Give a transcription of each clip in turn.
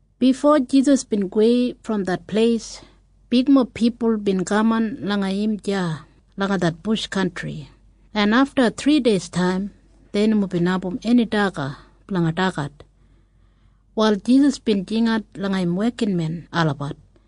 Bifo Jisas bin gowei brom det pleis, bigmob pipul bin kaman langa im deya langa det bush kantri, en afta thrideistaim dei nomo bin abum eni daga blanga dagat. Wal Jisas bin jingat langa im wekinmen olabat,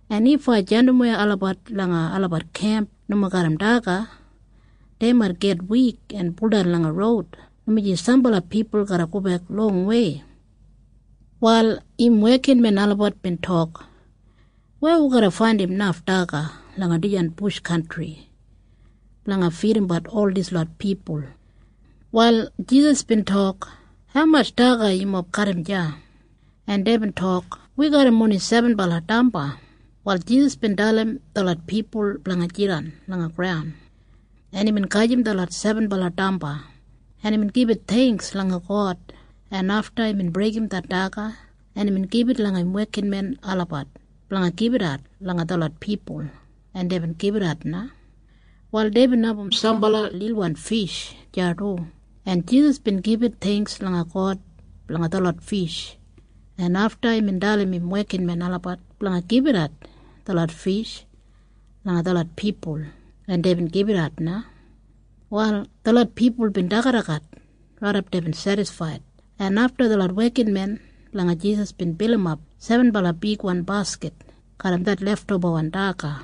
En if ai jandimwei olabat langa olabat kemp nomo garram daga, dei mait git wik en buldan langa roud, dumaji sambala pipul garra gobek longwei.” Wal im wekinmen olabat bin tok, “Weya wi garra faindim naf daga langa dijan bush kantri blanga fidimbat ol dislot pipul?” Wal Jisas bin tok, “Haumatj daga yumob garram deya?” En deibin tok, “Wi garram oni sebenbala damba.” Wal Jisas bin dalim detlot pipul blanga jidan langa graun, en imbin gajim detlot sebenbala damba, en imbin gibit theingks langa God, en afta imbin breigim det daga, en imbin gibit langa im wekinmen olabat blanga gibitat langa detlot pipul, en deibin gibitat na. Wal deibin abum sambala lilwan fish deya du, en Jisas bin gibit theingks langa God blanga detlot fish, en afta imbin dalim im wekinmen olabat blanga gibitat detlot fish langa detlot pipul, en deibin gibitat na. Wal detlot pipul bin dagadagat raidap deibin sedisfaid, en afta detlot wekinmen blanga Jisas bin bilimap sebenbala bigwan baskit garram det leftobawan daga.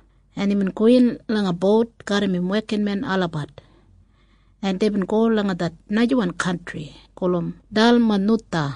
en imbin gowin langa bout garram im wekinmen olabat, en deibin go langa det najawan kantri gulum Dalmanutha.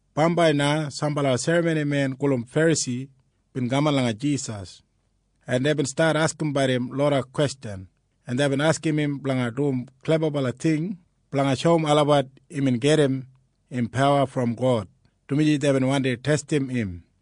Bambai na sambala serramonimen gulum Ferasi bin kaman langa Jisas, en deibin stat askimbat im loda kwestjan, en deibin askim im blanga dum klebabala ting blanga shoum olabat imbin gedim im pawa brom God, dumaji deibin wandi testim im.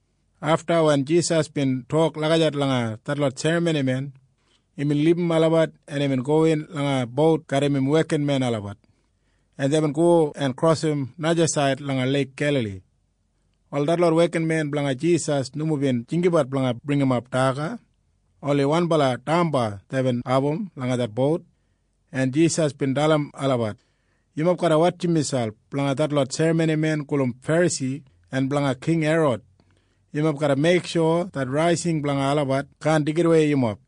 Afta wen Jisas bin tok lagijat langa detlot serramonimen, imbin libum olabat, en imbin gowin langa bout garram im wekinmen olabat, en deibin go en krosim najasaid langa Leik Gelali. Wal detlot wekinmen blanga Jisas nomo bin jinggabat blanga bringimap daga. Oni wanbala damba deibin abum langa det bout, en Jisas bin dalim olabat, “Yumob garra wotjim miselp blanga detlot serramonimen gulum Ferasi en blanga King Herod. Yumob garra meiksho det raising blanga olabat kaan deigidawei yumob.”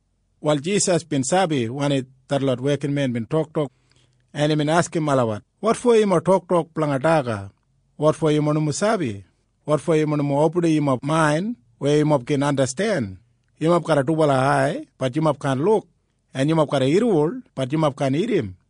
Wal Jisas bin sabi wanim detlot wekinmen bin toktok, en imbin askim olabat, “Wotfo yumob toktok blanga daga? Wotfo yumob nomo sabi? Wotfo yumob nomo opinim yumob main weya yumob gin andasten? Yumob garram dubala ai. Bat yumob kaan luk. En yumob garram irriwol. Bat yumob kaan irrim.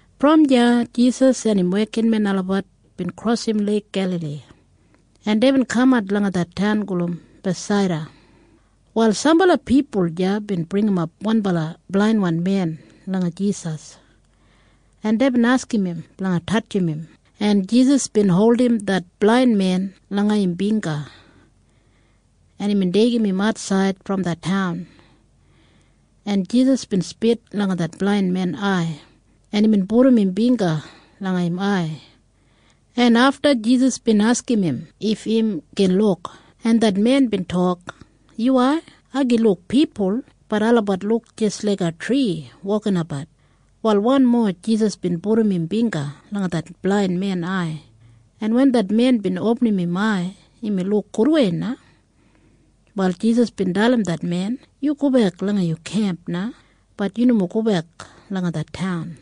Brom deya Jisas en im wekinmen olabat bin krosim Leik Gelali, en deibin kamat langa det taun gulum Bethsaida. Wal sambala pipul deya bin bringimap wanbala blainwan men langa Jisas, en deibin askim im blanga tatjim im, en Jisas bin holdim det blain men langa im bingga, en imbin deigim im atsaid brom det taun, en Jisas bin spit langa det blain men ai, en imbin pudum im bingga langa im ai, en afta Jisas bin askim im if im gin luk, en det men bin tok, “Yuwai, ai gin luk pipul. Bat olabat luk jis laiga tri wokabat.” Wal wanmo Jisas bin pudum im bingga langa det blain men ai, en wen det men bin opinim im ai imbin luk gudwei na. Wal Jisas bin dalim det men, “Yu gobek langa yu kemp na. Bat yu nomo gobek langa det taun.”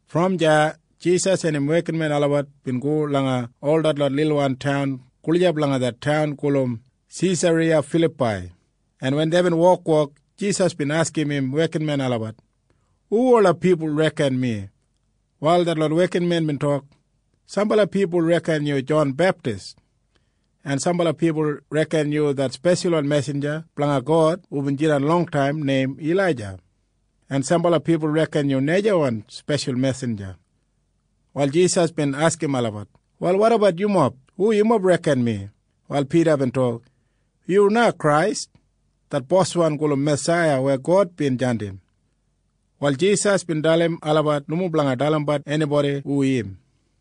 Brom deya Jisas en im wekinmen olabat bin go langa ol detlot lilwan taun gulijap langa det taun gulum Sesariya Filapai, en wen deibin wokwok, Jisas bin askim im wekinmen olabat, “Hu ola pipul reken mi?” Wal detlot wekinmen bin tok, “Sambala pipul reken yu Jon Beptis, en sambala pipul reken yu det speshalwan mesinja blanga God hubin jidan longtaim neim Ilaija, en sambala pipul reken yu najawan speshal mesinja.” Wal Jisas bin askim olabat, “Wal wotabat yumob? Hu yumob reken mi?” Wal Pida bin tok, “Yu na Krais, det Boswan gulum Masaiya weya God bin jandim.” Wal Jisas bin dalim olabat nomo blanga dalimbat enibodi hu im.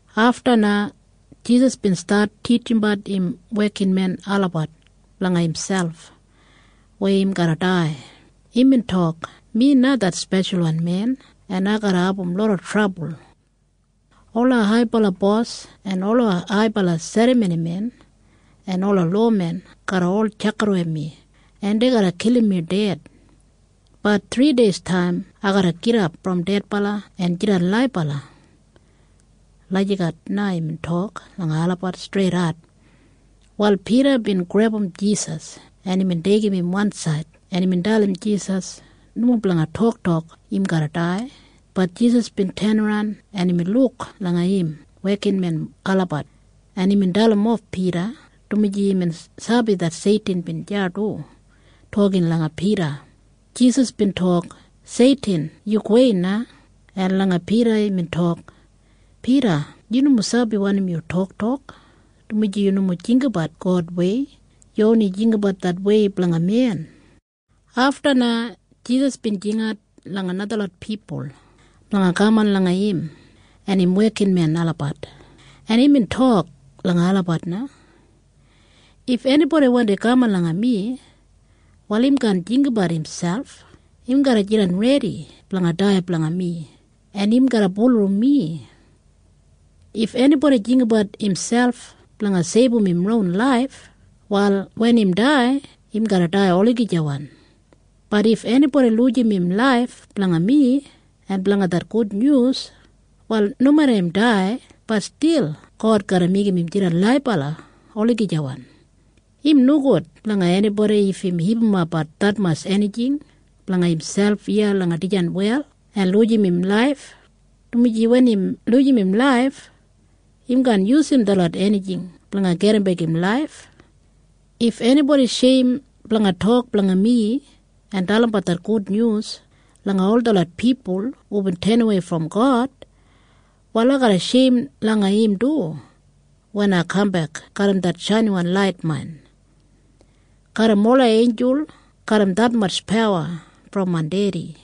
Afta na Jisas bin stat titjimbat im wekinmen olabat blanga imselp weya im garra dai. Imbin tok, “Mi na det Speshalwan Men, en ai garra abum loda trabul. Ola haibala bos en ola haibala serramonimen en ola lowamen garra ol tjakidawei mi, en dei garra kilim mi ded. Bat thrideistaim ai garra gidap brom dedbala en jidan laibala.” Lagijat na imbin tok langa olabat streidat. Wal Pida bin grebum Jisas, en imbin deigim im wansaid, en imbin dalim Jisas nomo blanga toktok im garra dai. Bat Jisas bin tenaran, en imbin luk langa im wekinmen olabat, en imbin dalimof Pida, dumaji imbin sabi det Seitin bin deya du toktok langa Pida. Jisas bin tok, “Seitin, yu gowei na.” En langa Pida imbin tok, “Pida, yu nomo sabi wanim yu toktok, dumaji yu nomo jinggabat Godwei. Yu oni jinggabat det wei blanga men.” Afta na Jisas bin jingat langa najalot pipul blanga kaman langa im en im wekinmen olabat, en imbin tok langa olabat na, “If enibodi wandi kaman langa mi, wal im kaan jinggabat imselp. Im garra jidan redi blanga dai blanga mi, en im garra bulurrum mi. If enibodi jinggabat imselp blanga seibum im ron laif, wal wen im dai, im garra dai olagijawan. Bat if enibodi lujim im laif blanga mi en blanga det gudnyus, wal nomeda im dai, bat stil God garra meigim im jidan laibala olagijawan. Im nogud blanga enibodi if im hipimapbat detmatj enijing blanga imselp iya langa dijan wel en lujim im laif, dumaji wen im lujim im laif, im kaan yusum detlot enijing blanga gedimbek im laif. If enibodi sheim langa mi en nomo dalimbat det gudnyus langa ol detlot pipul hubin tenawei brom God, wal ai garra sheim langa olabat du wen ai garra kambek garram det brabli shainiwan lait main, garram ola einjul en garram detmatj pawa brom main Dedi.”